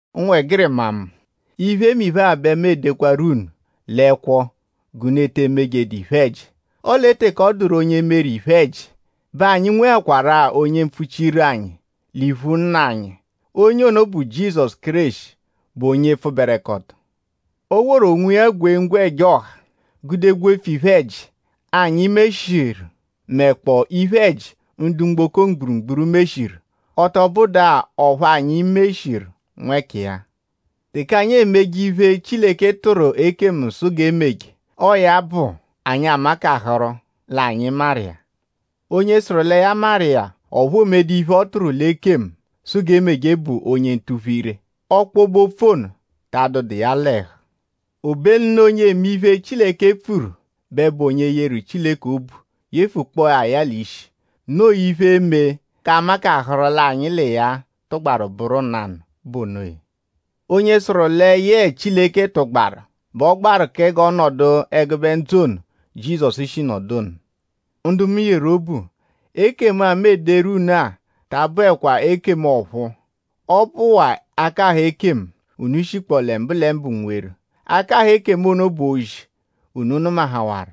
Ụnwegirima mu; iphemiphe-a bẹ mu edekwaru unu l'ẹkwo g'unu te emeje iphe-ẹji; ọle teke ọ dụru onye meru iphe-ẹji bẹ anyi nwekwarụ-a onye epfuchiru anyi l'iphu Nna anyi. Onye ono bụ Jizọsu Kéreshi, bụ onye pfụberekoto. O woru onwiya gwee ẹja ọha; gude gwefu iphe-ẹji, anyi meshiru mẹkpoo iphe-ẹji, ndu mgboko mgburugburu meshiru; ọ tọ bụdu-a ọphu anyi meshiru nwẹkiya. Teke anyi emeje iphe, Chileke tụru ekemu sụ g'e meje; ọo ya bụ anyi amakaharu l'anyi maru iya. Onye sụru lẹ ya maru iya; ọphu oomedu iphe, ọ tụru ekemu sụ g'e meje bụ onye ntuphu-ire; ọkpobe-opfu ta anọdu iya l'ẹhu. Obenu l'onye eme iphe, Chileke pfuru bẹ bụ onye yeru Chileke obu yefukpọo ya ya l'ishi. Noo iphe, e-me g'anyi makaharụ l'anyi l'iya tụgbaru bụru nanụ bụ onoya. Onye sụru lẹ yẹe Chileke tụgbaru bẹ ọ gbaru kẹ g'ọ nọdu ẹgube ndzụ ono, Jizọsu shi nọdu ono. Ndu mu yeru obu; ekemu-a, mu ederu unu-a ta abụekwa ekemu ọ̀phúú; ọ bụwaa akahụ ekemu, unu shikpọ lẹ mbụlembu nweru; akahụ ekemu ono bụ ozi, unu nụmahawaru.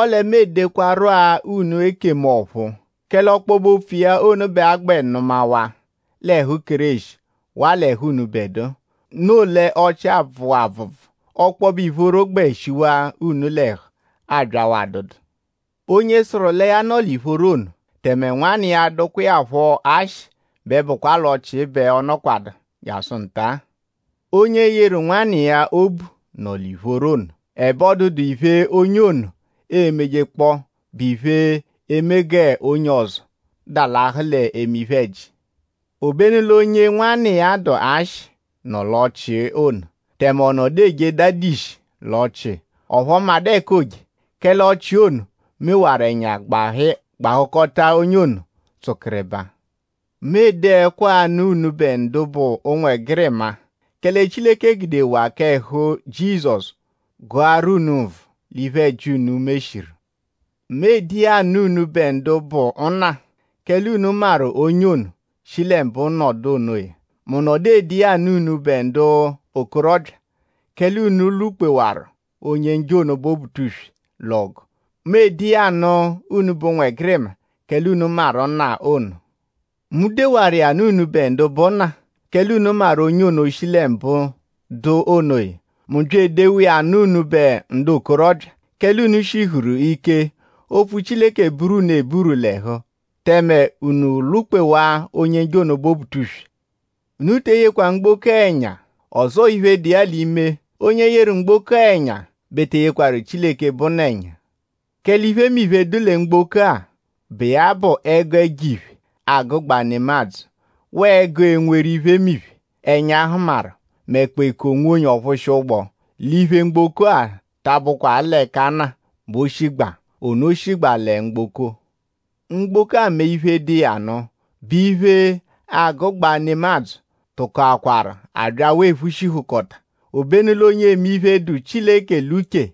Ọle mu edekwaru-a unu ekemu ọ̀phúú; kẹle ọkpobe-opfu iya ono bẹ a gbẹ nụmawaa l'ẹhu Kéreshi waa l'ẹhu unubẹdua; noo l'ọchii abvụwaa abvụbvu; ọkpobe ìphóró gbẹ shiwaa unu l'ẹhu abyawaa adụdu. Onye sụru lẹ ya nọ l'ìphóró ono; tẹme nwanna iya dụkwa iya phọ ashị bẹ bụkwa l'ọchii bẹ ọ nọkwadu byasụ nta-a. Onye yeru nwanna iya obu nọ l'ìphóró ono; ẹbe ọ dụdu iphe, onye ono emejekpọo bụ iphe, e-me g'onye ọzo dalahụ l'eme iphe-ẹji. Obenu l'onye nwanna iya dụ ashị nọ l'ọchii ono; tẹme ọ nọdu eje daadishi l'ọchii; ọphu ọ madụ ẹka ooje; kẹle ọchii ono mewaru ẹnya gbahụkota onye ono tsụkiribaa. Mu ede ẹkwo-a anụ unubẹ ndu bụ ụnwegirima; kẹle Chileke gudewaa k'ẹhu Jizọsu gụaru unu nvụ l'iphe-ẹji, unu meshiru. Mu ede iya anụ unubẹ ndu bụ nna; kẹle unu maru onye ono, shi lẹ mbụ dụ onoya. Mu nọdu ede iya anụ unubẹ ndu bụ okorọbya; kẹle unu lwụ-kpewaru Onye-Njọ ono, bụ Obutuswe l'ọgu. Mu ede iya anụ unubẹ ụnwegirima; kẹle unu maru nna ono. Mu dewaru iya nụ unubẹ ndu bụ nna; kẹle unu maru onye ono shi lẹ mbụ dụ onoya. Mu bya edewa iya nụ unubẹ ndu bụ okorọbya; kẹle unu shihuru ike; opfu Chileke buru unu eburu l'ẹhu; tẹme unu lwụ-kpewaa Onye-Njọ ono, bụ Obutuswe. Unu te eyekwa mgboko-a ẹnya; ọzoo iphe, dụ iya l'ime. Onye yeru mgboko-a ẹnya bẹ te eyekwaru Chileke bụ Nna ẹnya. Kẹle iphemiphe, dụ lẹ mgboko-a, bụ iya bụ ẹgu ẹjo-iphe, agụgbaa nemadzụ; waa ẹgu enweru iphemiphe, ẹnya hụmaru; mẹkpoo eku-onwonye ọ-phụshia-ụgbu l'iphe mgboko-a ta abụkwa l'ẹka Nna bẹ o shigbaa; ono shigbaa lẹ mgboko. Mgboko-a mẹ iphe, dụ iya nụ, bụ iphe, agụgbaa nemadzụ tụkokwaru abyawaa ephushihukọta; obenu l'onye eme iphe, dụ Chileke l'uche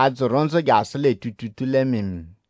a-dzụru ndzụ jasụ lẹ tuutuutuu lẹ mịimiimii.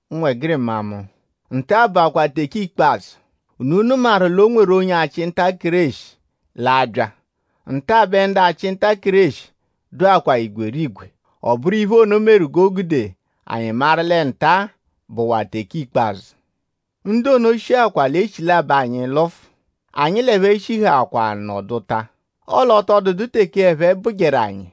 Ụnwegirima mu; nta-a bụakwa teke ikpazụ. Unu nụmawaru l'onye-achị-nta-Kéreshi l'a-bya. Nta bẹ ndu achị-nta-Kéreshi dụakwaa igwerigwe. Ọ bụru iphe ono meru g'o gude anyi maru lẹ nta-a bụwaa teke ikpazụ. Ndu ono shikwa l'echilabọ anyi lụfu; anyi l'ẹphe shihaakwa nọduta; ọle ọ tọ dụdu teke ẹphe bụjeru anyi.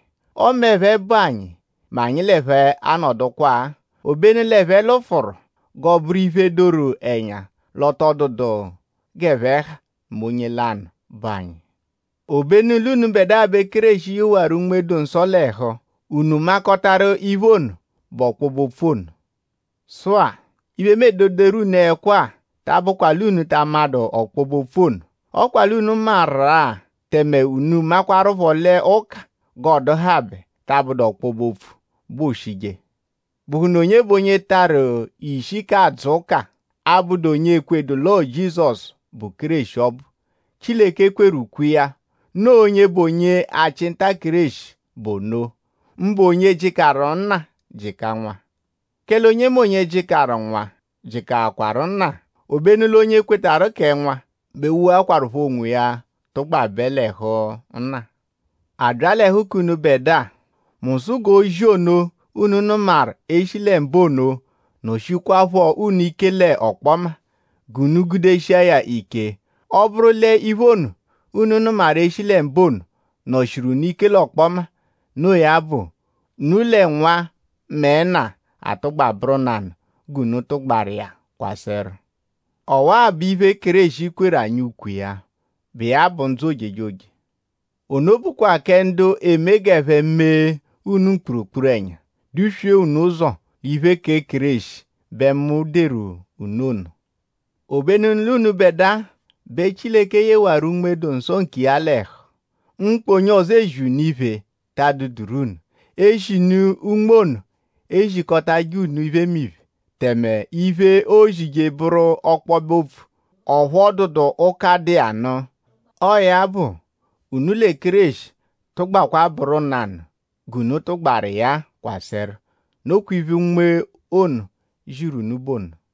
Ọme ẹphe bụ anyi mẹ anyi l'ẹphe anọdukwaa; obenu l'ẹphe lụfuru g'ọo-bụru iphe, doru ẹnya l'ọ tọ dụdu g'ẹphe ha mẹ onye lanụ, bụ anyi. Obenu l'unubẹdua bẹ Kéreshi yewaru Unme-dụ-Nsọ l'ẹhu; unu makọtaru iphe ono, bụ ọkpobe-opfu ono. Sụ-a; iphe, mu ededoru unu ẹkwo-a ta abụkwa l'unu ta amadụ ọkpobe-opfu ono. Ọ kwa l'unu maru iya; tẹme unu makwaruphọ l'ụka g'ọoduhabe ta abụdu l'ọkpobe-opfu bẹ ooshije. ?Bụhunu onye bụ onye tarụ ishi k'adzụ ụka, abụdu onye ekwedu l'ọo Jizọsu, bụ Kéreshi ọbu, Chileke kweru ukwe iya. Noo onye bụ onye-achị-nta-Kéreshi bụ ono; mbụ onye jịkaru Nna jịka Nwa. Kẹle onyemonye, jịkaru Nwa jịkawaru Nna. Obenu l'onye kwetarụ kẹ Nwa bẹ woakwaruphọ onwiya tụgbabe l'ẹhu Nna. A bya l'ẹhu k'unubẹdua; mu sụ g'ozi ono, unu nụmaru eshi lẹ mbụ ono nọ-shiẹkwapho unu ike l'ọkpoma; g'unu gudeshia ya ike. Ọ -bụru l'iphe ono, unu nụmaru eshi lẹ mbụ ono nọ-shiru unu ike l'ọkpoma; noo ya bụ; unu lẹ Nwa mẹ Nna atụgba bụru nanụ; g'unu tụgbaru iya kwasẹru. Ọwa-a bụ iphe, Kéreshi kweru anyi ukwe iya, bụ iya bụ ndzụ ojejoje. Ono bụkwa kẹ ndu eme g'ẹphe mee unu mkpurukpuru-ẹnya; duswee unu ụzo l'iphe kẹ Kéreshi bẹ mu deru unu ono. Obenu l'unubẹdua bẹ Chileke yewaru Unme-dụ-Nsọ nkiya l'ẹhu. Mkpa onye ọzo, ezi unu iphe ta adụeduru unu; eshinu Unme ono ezikọtaje unu iphemiphe; tẹme iphe, oozije bụru ọkpobe-opfu; ọphu ọ dụdu ụka, dụ iya nụ. Ọo ya bụ; unu lẹ Kéreshi tụgbakwa bụru nanụ g'unu tụgbaru iya kwasẹru. Nokwa iphe Unme ono ziru unu bụ ono.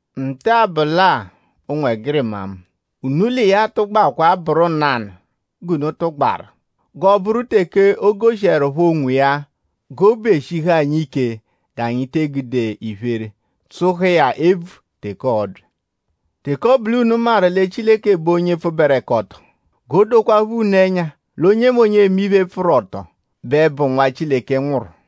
Nta-a bụ lẹ-a; ụnwegirima mu; unu l'iya tụgbakwa bụru nanụ g'unu tụgbaru; g'ọoburu teke o goshiẹrupho onwiya g'obu eshihu anyi ike g'anyi te egude iphere tsụhu iya ebvu teke ọobya. Teke ọ bụ l'unu maru lẹ Chileke bụ onye pfụberekoto; g'o dokwaaphọ unu ẹnya l'onyemonye, eme iphe, pfụru ọto bẹ bụ nwa, Chileke nwụru.